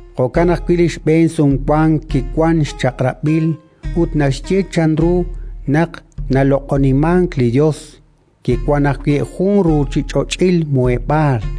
Jo'kan ajwi' li xb'een Sumwank kiwank xchaq'rab'il ut naxye chanru naq naloq'imank li Yos; kiwank ajwi' jun ruuchich'och'il muheb'aal.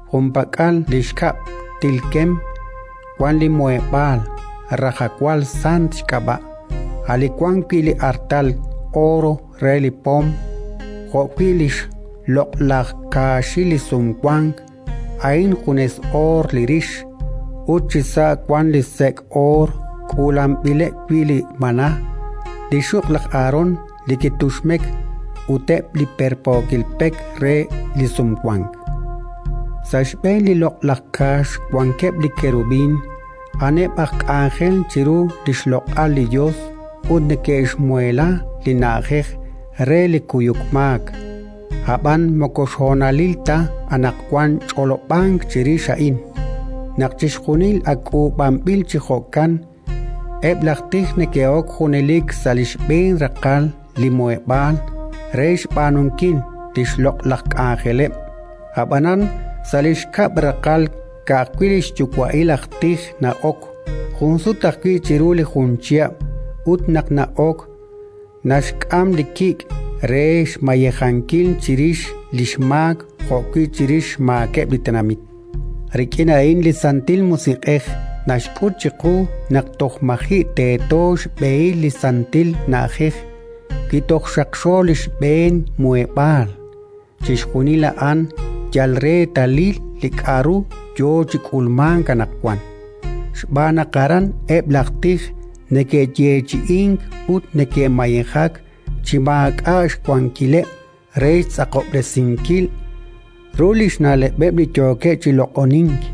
Junpak'al li xkab' t'ilkem wank li Muheb'aal, Rajawal Sant xk'ab'a', li wan wi' li artal oor re li pom, jo'wi' li xloq'laj Kaaxil li Sumwank (a'in junes oor li rix), ut chisa' wank li sek' oor k'uulanb'ileb' wi' li maná, li xxuq' laj Aharón li kituxmek ut eb' li perpookil pek re li Sumwank. Sa' xb'een li loq'laj Kaax wankeb' li kerubín: a'aneb' aj k'anjel chiru li xloq'al li Yos, ut neke'xmuheela li na'ajej re li kuyuk maak. Ab'an moko xhonalil ta anaqwan ch'olob'ank chirix a'in. Naq chixjunil ak k'uub'anb'il chi jo'kan, eb' laj tij neke'ok junelik sa' li xb'een raqal li Muheb'aal re xb'aanunkil li xloq'laj k'anjeleb'. Ab'anan, sa' li xkab' raqal, ka'ajwi' li xyuwa'il aj tij na'ok, jun sut ajwi' chiru li jun chihab'; ut naq na'ok, naxk'am li kik' re xmayejankil chirix li xmaak jo'wi' chirix xmaakeb' li tenamit. Rik'in a'in li Santil Musiq'ej naxk'ut chiqu naq toj maji' teeto xb'ehil li Santil Na'ajej, wi toj xaqxo li xb'een Muheb'aal. Chixjunil a'an yal reetalil li k'aru yo chi k'ulmank anaqwan, xb'aan naq aran eb' laj tij neke'yeechi'ink ut neke'mayejak chi maak'a' xwankileb' re xtz'aqob'resinkil ru li xna'leb'eb' li yookeb' chi loq'onink: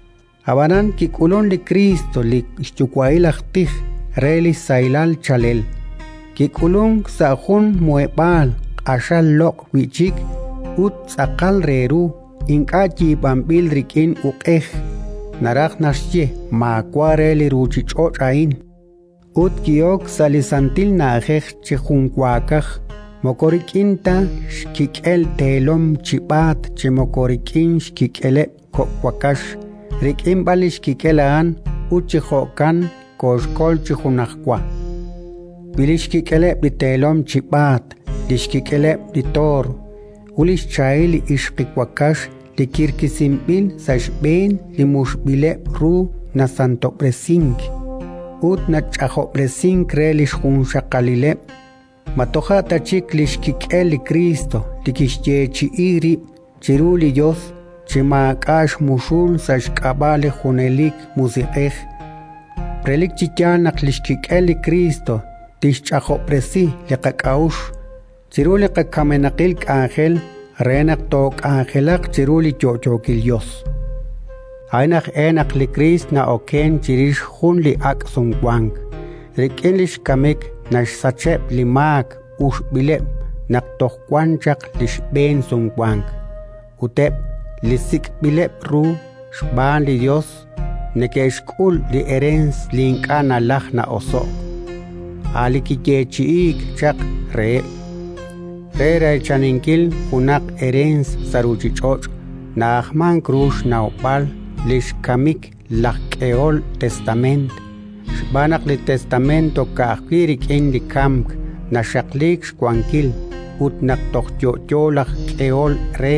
Ab'anan kik'ulunk li Kriist, li xyuwa'il aj tij re li sahilal chaalel. Kik'ulunk sa' jun muheb'aal q'axal loq' wi' chik ut tz'aqal re ru, ink'a' yiib'anb'il rik'in uq'ej; naraj naxye, maawa' re li ruuchich'och' a'in. Ut ki'ok sa' li Santil Na'ajej chi junwaakaj, moko rik'in ta xkik'el teelom chib'aat chi moko rik'in xkik'eleb' kok' wakax, rik'in b'an li xkik'el a'an; ut chi jo'kan kooxkol chi junajwa. Wi li xkik'eleb' li teelom chib'aat, li xkik'eleb' li toor ut li xchahil li ixqiwakax li kirkisinb'il sa' xb'een li muxb'ileb' ru nasantob'resink ut nach'ajob'resink re li xjunxaqalileb', ma toja' ta chik li xkik'el li Kriist li kixyeechi'i rib' chiru li Yos chi maak'a' xmuxul sa' xk'ab'a' li junelik Musiq'ej? Relik chi yaal naq li xkik'el li Kriist tixch'ajob'resi li qak'a'uxl chiru li qakamenaqil k'anjel, re naq took'anjelaq chiru li yo'yookil Yos! A'in aj e naq li Kriist na'okenk chirix jun li ak' Sumwank. Rik'in li xkamik naxsacheb' li maak uxb'ileb' naq toj wan chaq li xb'een Sumwank, ut eb' li sik'b'ileb' ru xb'aan li Yos neke'xk'ul li ereens li ink'a' nalajk na'oso'k, a' li kiyeechi'iik chaq reheb'. Re reechaninkil junaq ereens sa' ruuchich'och' na'ajmank ru xnawb'al li xkamik laj k'ehol testameent, xb'aan naq li testameent ka'ajwi' rik'in li kamk naxaqliik xwankil, ut naq toj yo'yo laj k'ehol re,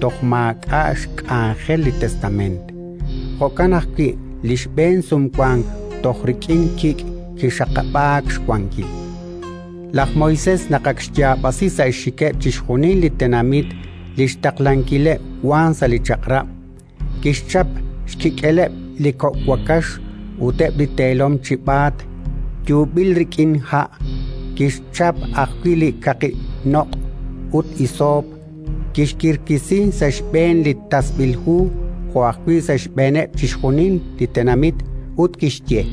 toj maak'a' xk'anjel li testameent. Jo'kan ajwi' li xb'een Sumwank toj rik'in kik' kixaqab'aak xwankil. Laj Moisés naq ak xyaab'asi sa' xxikeb' chixjunil li tenamit li xtaqlankileb' wank sa' li Chaq'rab', kixchap xkik'eleb' li kok' wakax ut eb' li teelom chib'aat yuub'il rik'in ha'; kixchap ajwi' li kaqi noq' ut hisoop, kixkirkisi sa' xb'een li tasb'il hu jo' ajwi' sa' xb'eeneb' chixjunil li tenamit, ut kixye: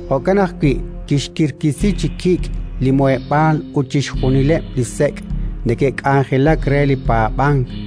Jo'kan ajwi' kixkirkisi chi kik' li Muheb'aal ut chixjunileb' li sek' neke'k'anjelak re li paab'ank,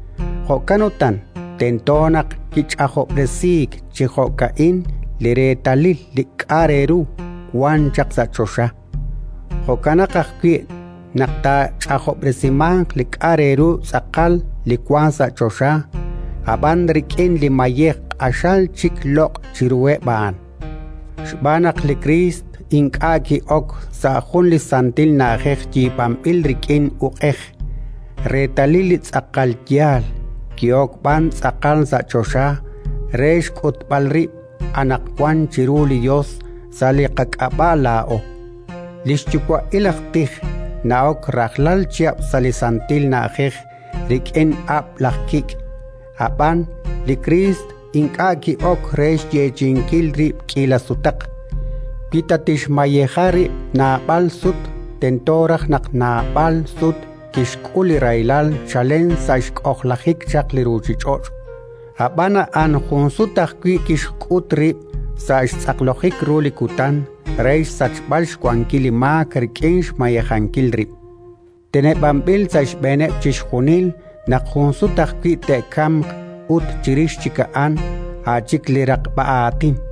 Jo'kan utan, tento naq kich'ajob'resiik chi jo'ka'in li reetalil li k'a' re ru wan chaq sa' choxa. Jo'kanaq ajwi' naq taach'ajob'resimanq li k'a' re ru tz'aqal, li wank sa' choxa, ab'an rik'in li mayej q'axal chik loq' chiruheb' a'an. Xb'aan naq li Kriist ink'a' ki'ok sa' jun li santil na'ajej yiib'anb'il rik'in uq'ej, reetalil li tz'aqal yaal; ki'ok b'an tz'aqal sa' choxa re xk'utb'al rib' anaqwan chiru li Yos sa' qak'ab'a' laa'o. Li xyuwa'il aj tij na'ok rajlal chihab' sa' li Santil Na'ajej rik'in ab'l aj kik'. Ab'an li Kriist ink'a' ki'ok re xyeechi'inkil rib' k'iila sutaq. Wi ta kixmayeja rib' naab'al sut, tento raj naq naab'al sut kixk'ul li rahilal chalen sa' xk'ojlajik chaq li ruuchich'och'. Ab'an a'an jun sut ajwi' kixk'ut rib', sa' xtz'aqlojik ru li kutan, re xsachb'al xwankil li maak rik'in xmayejankil rib'. Teneb'anb'il sa' xb'eeneb' chixjunil naq jun sut ajwi' te'kamq ut, chirix chik a'an, a' chik li raqb'a aatin.